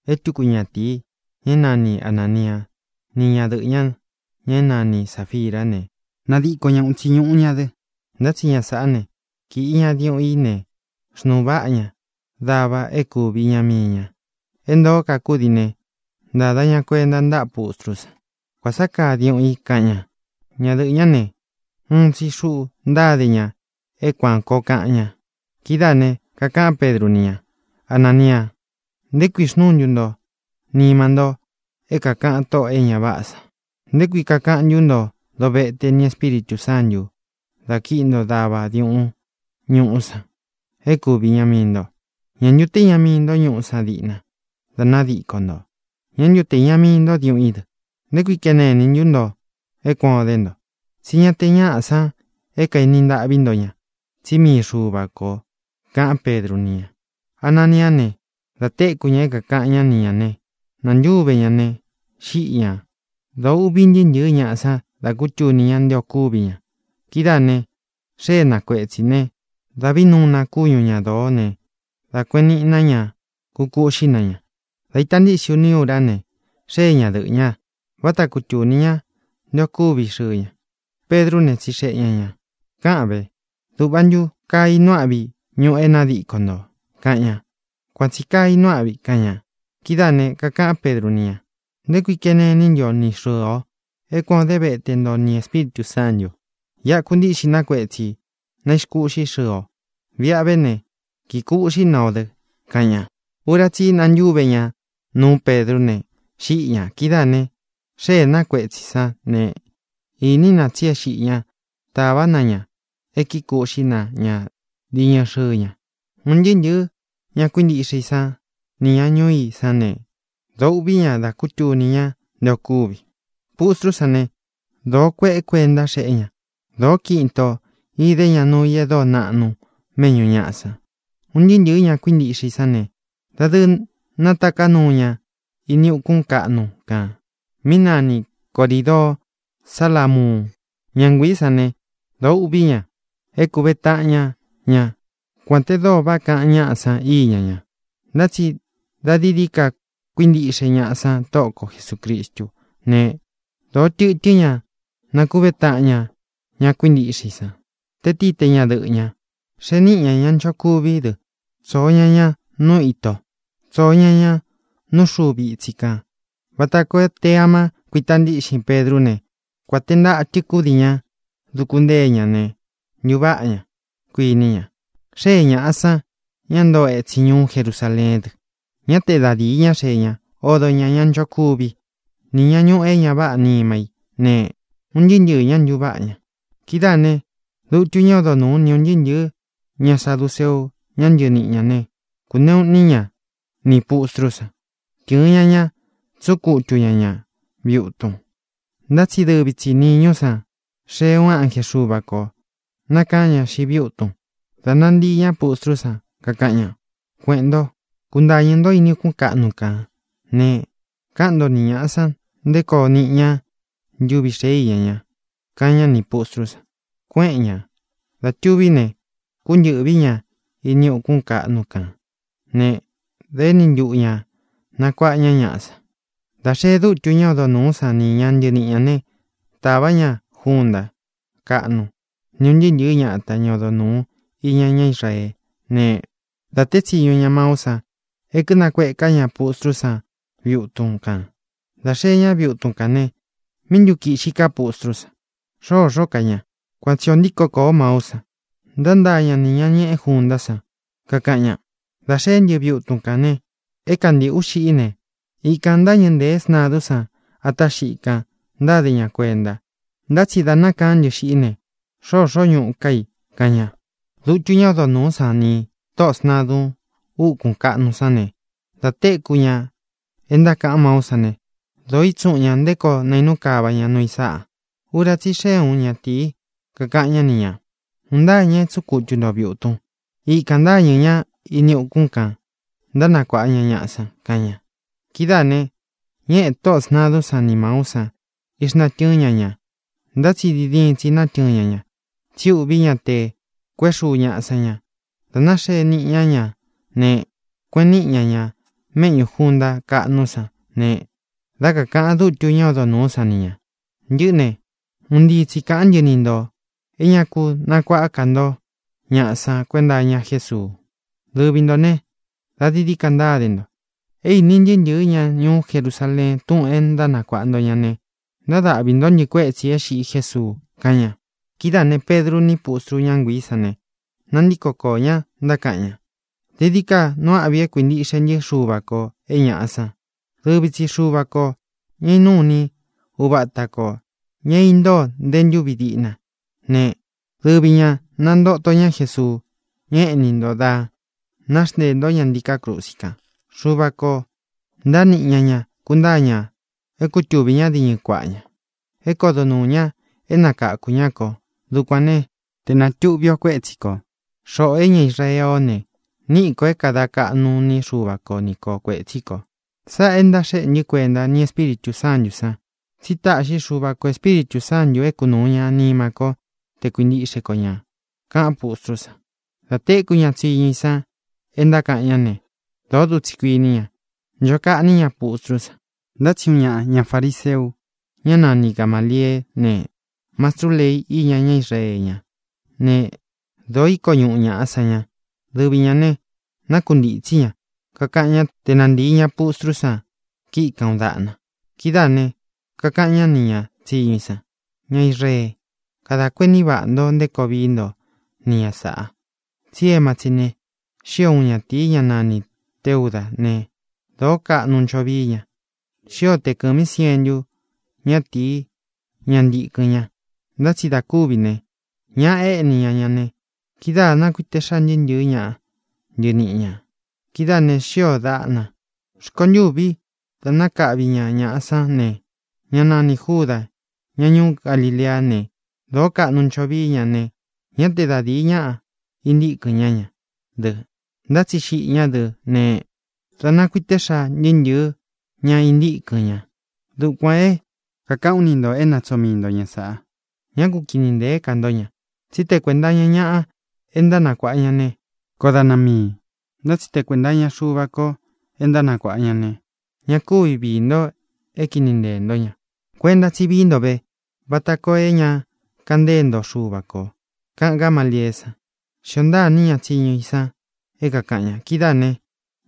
É tuku ñatīi, ña é nani Anānia, ni ñádɨꞌɨ̄ ña, ña é nani Sāfirá ne, nádiko ña uun itsi ñūꞌu ña dɨ. Ntá tsi ña sāꞌá ne, kīꞌi ña diuꞌun í ne, xnūu váꞌa ña dava é kūvi iña mii ña. É ntōó ka kúdii ne, ntada ña kuenta ntáꞌa pustrú san. —Kuān sá kaa diuꞌun i —kaꞌan ña. Ñadɨꞌɨ̄ ñá ne, uun tsi xuꞌu ntáde ña é kuān koo kaꞌan ña. Kidáā ne, kakaꞌán Pedru ni ña: —Anania, ¿nté kui xnúu ntu nto nima nto é kākaꞌan Tóꞌō é ña váꞌā san? ¿Nté kui kakaꞌan ntú nto dovete nī Espíritū Sántū dá kīꞌi nto dava diuꞌun ñuꞌu san é kuvi iña mii nto? ¿Ñá ntu te īña mii nto ñuꞌu sán diꞌna dá nadiko ntō? ¿Ñá ntu te īña mii ntó diuꞌun í dɨ? ¿Nté kui kene iní ntu nto é kuan ō dé nto? Tsí ña te ñaꞌá san é kaeni ntaꞌví nto ña, tsí mii Xuva kō —kaꞌán Pedru ni ña. Ananiá ne, dā téku ña é kākaꞌan ñá ni ñā ne, nantúve ña ne, xíꞌi ñā. Dōo uꞌví ntɨɨ́ ntɨ̄ɨ́ ñaꞌa san da kútuni ña nte o kúvi ña. Kidáā ne, xée na kuetsī ne, dáꞌvī nuu na kúñu ña dōó ne, dā kueꞌen níꞌi na ña, kúkuꞌxí na ña. Dā ita ntíꞌxin uni úra ne, xée ñadɨꞌɨ̄ ña. Váta kutūni ñá nte o kúvi xɨɨ ña. Pedrú ne, tsixeꞌe ña ñā: —Káꞌan vē: ¿Dūꞌva ntu kaa inuu áꞌvi ñūꞌu é nádiko ntō? —kaꞌan ña. —Kuan tsī kaa inuu áꞌvi —kaꞌan ña. Kidáā ne, kakaꞌán Pedru ni ña: —¿Nté kuī kéne iní ntu o ni xɨ̄ɨ o é kuan ō dé vete nto nī Espíritū Sántū? Iꞌa kuntíꞌxi na kuetsī, na ixkúꞌxi xɨɨ o. Viꞌa ve ne, kikuꞌxí na o dɨ —kaꞌan ña. Ura tsí i nantúve ña nuú Pedrú ne, xíꞌi ñā. Kidáā ne, xée na kuetsī sán ne, īní na tsi é xiꞌi ña. Tāvá na ña é kíkūꞌxí na ña diñɨ xɨɨ ña. Un ntɨɨ́ ntɨ̄ɨ́ ña kuíntiꞌxe i sán nī ña ñuu i sán ne, dōo uꞌví ña da kútuni ña nte o kúvi. Pustrú san ne, dōó kueꞌe kuénta xēꞌé ña; dōó kiꞌin itō idé ña nuu i e dóo naꞌnu méꞌñū ñaꞌa san. Un ntɨɨ́ ntɨ̄ɨ́ ña kuíntiꞌxe i sán ne, dadɨɨ nátaká nuu ña ini ukún kaꞌnu kān mí nani Corīdoo Salámuun. Ñá nguiī sán ne, dōo uꞌví ña é kuve taꞌan ña ña, kuān te dóo váꞌa kaꞌan ñáꞌa san iña ña. Ntá tsi dā dií dií ka kuíntiꞌxe ñaꞌa san Tóꞌo ko Jesūcristú ne, dōo tɨtɨ́n ña nákuve taꞌan ña ña kuíntiꞌxe i san, te tíi te ñadɨꞌɨ̄ ña. Xee níꞌi ña ña nchokuví dɨ, tsōo ña ña nú ito, tsōo ña ña nú xūvi ítsi kān vata koo te āma kuita ntíꞌxin Pedrú ne, kuān té ntatɨ kúdii ña duku ntée ña ne, ntuváꞌa ña, kuiní ña. Xée ñāꞌa san, ña ntoo etsin ñuú Jerusaleén dɨ. Ñá te da dīi ñá xee ña, odo ñā ña nchokuví, ni ña ñuꞌū é ña váꞌā nima í ne, un ntɨɨ́ ntɨɨ̄ ñá ntuváꞌa ña. Kidáā ne, dutu ñá odo nūú ni ūn ntɨɨ́ ntɨ̄ɨ́ ña saduceu, ñá ntɨɨ niꞌi ñā né, kūneꞌu iní ña nī pustrú san. Tɨ̄ɨn ña ña, tsúꞌun kutu ña ñā viꞌi utun. Ntá tsi dɨvi tsi nīñú san xee uun ánje Xuva kō, nákaán ña xiꞌi viꞌi utun, da nantíi ñā pustrú san, kakaꞌan ña: —Kueꞌēn ntó, kuntañɨ̄ ntó ini ukún kaꞌnu kān ne, káꞌan nto ni ñāꞌa san nté koo niꞌi ña ntuvi xēé iña ña —kaꞌan ñá nī pustrú san. Kuéꞌen ñā. Dā tuví ne, kúntɨ̄ꞌví ña ini ukún kaꞌnu kān ne, dā éni ntuꞌu ña nakuāꞌa ña ñaꞌá san. Dā xee dútu ñá odo nūú san ni ña ntɨɨ niꞌi ñā né, tāvá ña junta káꞌnu ni ūn ntɨɨ́ ntɨ̄ɨ́ ñata, ña odo nūú iña ñá Israeé ne, dā teé tsiñu ña maú san é kinakueká ña pustrú san viꞌi utun kān. Dā xee ñá viꞌi utun kān ne, ¿míꞌi ntu kīꞌxi ká pustrú san? Xoxó ka ña. Kuan tsi ō ntíko kōo maú san. Ntántaa ña nī ña ñeꞌe júntā san, kakaꞌan ña: —Dā xeé ntɨ viꞌi utun kān ne, é kantīꞌú xiꞌi i ne, ikān ntáñɨ̄ ntée sntadún san atá xiꞌi i kan, ntáde ña kuenta; ntá tsi dā nákaán ntɨ xiꞌi í ne, xoxó ñuꞌu ká i —kaꞌan ña. Dutu ñá odo nūú san nī tóꞌō sntadun úkūn kaꞌnu sán ne, dā téku ña é ntákaꞌan máú san ne, dōo ítsuꞌun ña nté koo naīnú kava ña nuu i sáꞌa. Ura tsí i xee úun ñatīi, kakaꞌan ñá ni ñā: —Un ntáa ña é tsuꞌun kutu ntō viꞌi utun. Ikān ntáñɨ̄ ñá ini ukún kān, ntánakuāꞌa ña ñaꞌa san —kaꞌan ña. Kidáā ne, ñéꞌē tóꞌō sntadún san ni māú san, ixnatɨ́ɨn ña ñā. Ntá tsi diin diin tsi nátɨɨn ña ña, tsi úꞌvī ñá te kuēꞌé xuu ñāꞌa san ña. Dā náxee niꞌi ña ñá ne, kueꞌen níꞌi ña ña méꞌñū junta káꞌnú san ne, dá kakāꞌan dútu ñá odo nūú san ni ñā: —Ntɨꞌɨ́ ne, un ntii tsi kaꞌán ntɨ ni ntō é ña ku nakuaꞌá ka nto ñaꞌa san kuenta iña Jésuu. Dɨvi ntō né, dā dií dií ka ntáde nto. É īni ntɨɨ́ ntɨ̄ɨ́ ña ñuú Jerusaleen túꞌūn é ntánakuāꞌa nto ña ne, ntadáꞌvi ntō ntɨ́ kuétsi ī é xiꞌi Jésuu —kaꞌan ña. Kidáā ne, Pedru ní pustru ñá nguiī sán ne, nantíko koō ñá, ntákaꞌan ña: —Dií dií ka nuu áꞌvi é kuīntiꞌxe ntɨ́ Xuva kō é ñaꞌa san. Dɨvi tsi Xuva kō, ña é inúu ini uva ata kō, ña é intóo nte ntúvi diꞌna ne, dɨvi ñā nantoto ñá Jesuu, ña éꞌní nto dá náxnteē ntó ña ntiká krusi kan. Xuva kō ntáa niꞌi ña ña, kuntáa ña é kutuvī ñá diñɨ kuaꞌa ña, é kodo nuū ña, é nakakū ñá kō. Dukuān né, te nātuꞌvi o kuétsi ko, xoꞌō é ña Israeé ō ne, niꞌi ko é kāda kaꞌnu iní Xuva ko ni ko kuētsí kō. Sáꞌā é ntaxéꞌe ntɨ́ kuenta, ni Espíritū Sántū san, tsí taꞌxi Xuva kō Espíritū Sántū é kunūu ña nima ko te kuíntiꞌxe ko ñā —kaꞌán pustrú san. Dā téku ña tsiñu i san é ntákaꞌan ñá ne, dōó dutsī kuiní ña. Ncho kaꞌní ña pustrú san. Ntá tsi uun ñaꞌa, ña farīseu, ñá nani Gamālieé ne, mastrú lei iña ñá Israee ñá, ne, dōo íko ñuꞌu ñāꞌa san ña. Dɨvi ñā ne, nákuntītsí ña, kakaꞌan ñá te nantīi ña pustrú san kiꞌi kan uun daꞌna. Kidáā ne, kakaꞌan ñá nī ña tsiñu i san: —Ña Israeé, kadā kuení vaꞌā ntó nté koo vií nto ni ña sāꞌa. Tsí emá tsi ne, xío uun ñatīi, ñá nanī Teudá ne, dōó kaꞌnu ncho vií ña. Xío te kɨ̄mí sientu ñátīí, ña ntīkɨn ña. Ntá tsi dā kúvi ne, ñaꞌa éꞌní ña ña ne, kidáā nákuite xáa ntɨɨ́ ntɨ̄ɨ́ ña ntɨɨ niꞌi ñā. Kidáā ne, xíō daꞌna. Rkontûví, ntuvi dá nakaꞌvi ña ñāꞌa sán ne, ñá nanī Júdā, ña ñuú Galileá ne, dōó kaꞌnu ncho vií ña ne, ñá te da dīi ñaꞌa intíkɨn ñá ña dɨ. Ntá tsi xiꞌi ñá dɨ ne, dā nákuite xáa ntɨɨ́ ntɨ̄ɨ́ ña intíkɨn ña. Dukuān é kākaꞌán u ni ntō é na tsoo mii nto ña sāꞌa. Ñá ku kini ntēé ka ntó ña. Tsí te kuēnta iña ñáꞌa é ntánakuāꞌa ña ne, koó daꞌna miī. Ntá tsi te kuēnta iña Xuva ko é ntánakuāꞌa ña ne, ña kúvi viī nto é kini nteē ntó ña. Kuenta tsí vií nto ve vata koo é ña kaꞌan ntée nto Xuva kō —kaꞌan Gámalieé san. Xíō ntaa iní ña tsiñu i san é kākaꞌan ña. Kidáā ne,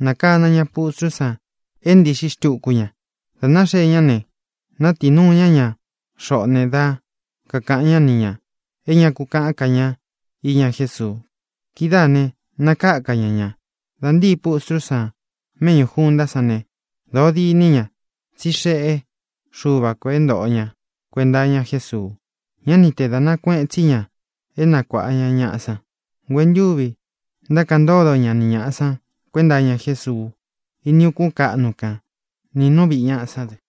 nákana ña pustrú san é ntīꞌxi xtuku ña. Dā náxee ñá ne, nátiī nuu ña ña xoꞌó ne, dá kakāꞌan ñá ni ñā é ña ku kaꞌán ka ña iña Jésuu. Kidáā ne, nakáka ña ña. Dā ntíi pustrú san méꞌñū juntá san ne, dōo diní ña, tsí xeꞌé Xuva kō é ntōꞌo ña kuenta iña Jésuu. Ñá ni tee dāꞌna kueꞌen tsí ña é nakuāꞌa ña ñaꞌá san. Nguentúvi ntákaꞌan ntódo ña ni ñāꞌa san kuenta iña Jésuu ini ukún kaꞌnu kan nī nú viꞌi ñāꞌa sán dɨ.